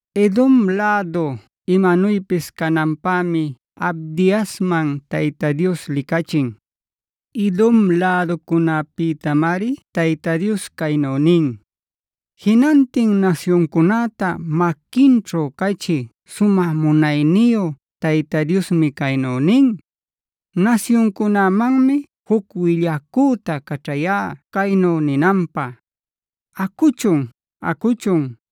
Edom lädu imanuypis cananpämi Abdiasman Tayta Dios licachin. Edom läducunäpïtamari Tayta Dios caynu nin: “Jinantin nasyuncunäta maquinćhu cachï Sumä Munayniyu Tayta Diosmi caynu nin: Nasyuncunämanmi juc willacüta caćhayá caynu ninanpä: ‘¡Acuchun! ¡Acuchun!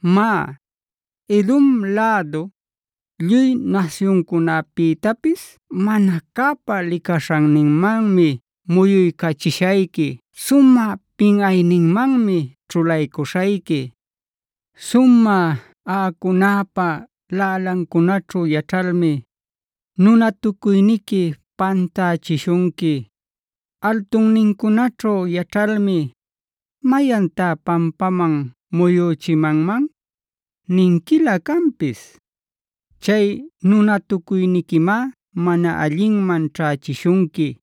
“Má, Edom lädu, lluy nasyuncunapïtapis mana cäpa licaśhanninmanmi muyuycachishayqui; sumä pinꞌayninmanmi ćhulaycüśhayqui. Sumä aꞌacunäpa laꞌalancunaćhu yaćhalmi, nunatucuyniqui pantächishunqui; altunnincunaćhu yaćhalmi: ‘¿Mayantá pampaman muyüchimanman?’ ninquilä canpis. Chay nunatacuyniquimá mana allinman ćhächishunqui.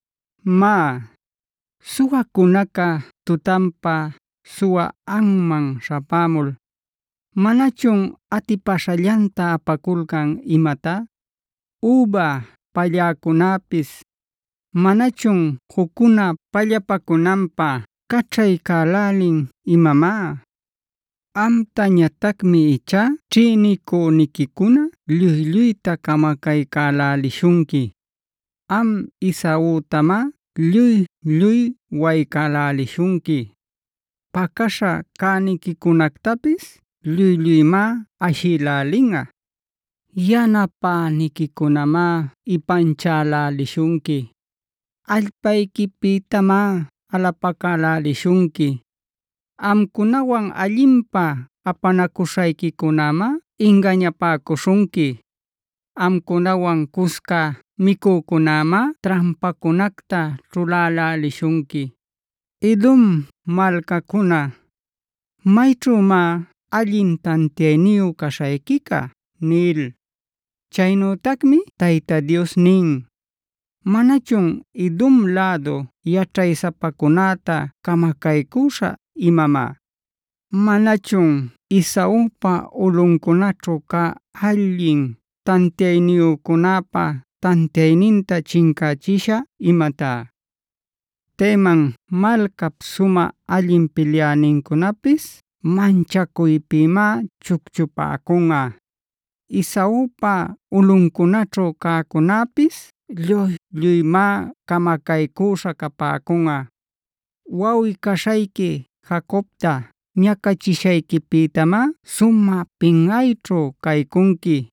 “Má, suwacunaca tutanpa suwä anman śhapämul, ¿manachun atipäśhallanta apaculcan imatá? Üba palläcunäpis, ¿manachun juccuna pallapacunanpä caćhaycälin imamá? Amtañatacmi ichá ćhïnicüniquicuna lluy-lluyta camacaycälälishunqui. Am Esautamáb lluy-lluy waycälälishunqui. Pacäśha cäniquicunactapis lluy-lluymá ashïlälinꞌa. Yanapäniquicunamá ipanchälälishunqui; allpayquipïtamá alapacälälishunqui. Amcunawan allinpä apanacuśhayquicunämá ingañapäcuśhunqui; amcunawan cusca micücunämá trampacunacta ćhuläläliśhunqui. Edom malcacuna, ¿mayćhümá allin tantiayniyu caśhayquica?” nil. Chaynütacmi Tayta Dios nin: “¿Manachun Edom lädu yaćhaysapacunäta camacaycüśhä imamá? ¿Manachun Esaupa ulꞌuncunaćhu cä allin tantiayniyücunäpa tantiayninta chincächishä imatá? Teman malcap sumä allin pilyänincunapis manchacuypïmá chucchupäcunꞌa. Esaupa ulꞌuncunaćhu cäcunäpis lluy-lluymá camacaycüśha capäcunꞌa. “Wawꞌi-caśhayqui Jacobta ñacachishayquipïtamá sumä pinꞌayćhu caycunqui;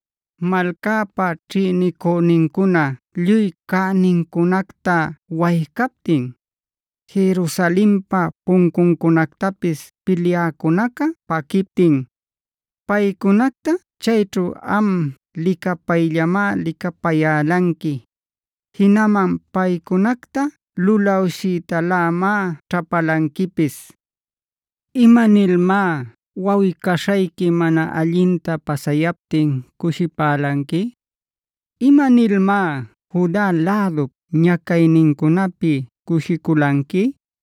Malcäpa ćhïnicünincuna lluy cänincunacta waycaptin, Jerusalenpa puncuncunactapis pilyäcunaca paquiptin, paycunacta chayćhu am licapayllamá licapayälanqui; Jinaman paycunacta lulawshiytalämá ćhapalanquipis. ¿Imanilmá wawꞌi-caśhayqui mana allinta pasayaptin cushipälanqui? ¿Imanilmá Juda lädup ñacaynincunapi cushiculanqui?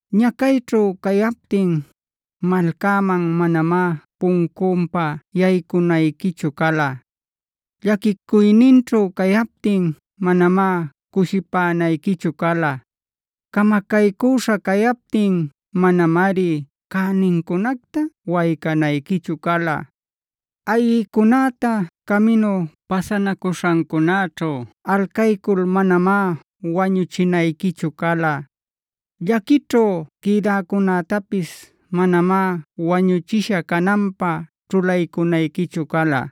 Ñacayćhu cayaptin, malcäman manamá puncunpa yaycunayquichu cala. Llaquicuyninćhu cayaptin, manamá cushipänayquichu cala. Camacaycüśha cayaptin, manamari cänincunacta waycanayquichu cala. Ayꞌïcunäta caminu pasanacuśhancunäćhu alcaycul manamá wañuchinayquichu cala. Llaquićhu quïdäcunätapis manamá wañuchisha cananpä ćhulaycunayquichu cala.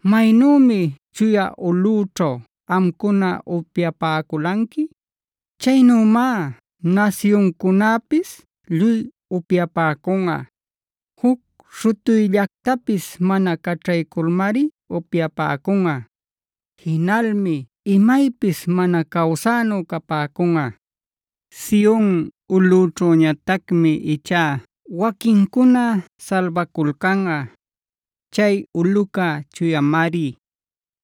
Maynümi chuya ulꞌüćhu amcuna upyapäculanqui, chaynümá nasyuncunäpis lluy upyapäcunꞌa. Juc śhutuyllactapis mana caćhayculmari upyapäcunꞌa; jinalmi imaypis mana cawsänu capäcunꞌa. “Sion ulꞌućhüñatacmi ichá waquincuna salbaculcanꞌa; chay ulꞌuca chuyamari.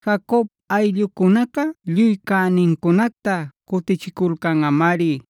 Jacob ayllucunaca lluy cänincunacta cutichiculcanꞌamari.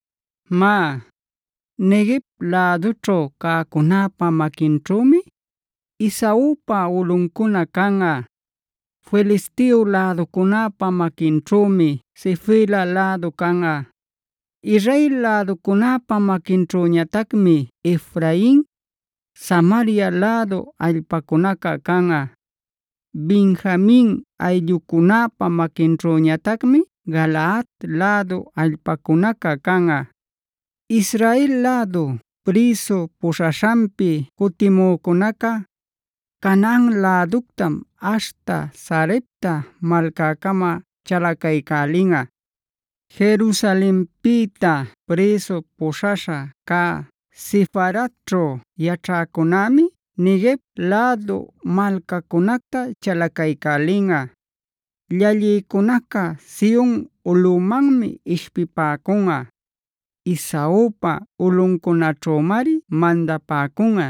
“Má, Neguev lädućhu cäcunäpa maquinćhümi Esaupa ulꞌuncuna canꞌa. Filisteo läducunäpa maquinćhümi Sefela lädu canꞌa. Israel läducunäpa maquinćhüñatacmi Efrain, Samaria lädu allpacunaca canꞌa. Benjamin ayllucunäpa maquinćhüñatacmi Galaad lädu allpacunaca canꞌa. Israel lädu prïsu puśhaśhanpi cutimücunaca, Canaan läductam aśhta Sarepta malcäcama chalacaycälinꞌa. Jerusalenpïta prïsu puśhaśha cä Sefaradćhu yaćhäcunämi Neguev lädu malcacunacta chalacaycälinꞌa. Llallïcunaca Sion ulꞌumanmi ishpipäcunꞌa; Esaupa ulꞌuncunaćhümari mandapäcunꞌa.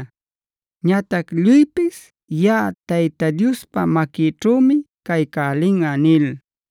Ñatac lluypis yaꞌa Tayta Diospa maquïćhümi caycälinꞌa” nil.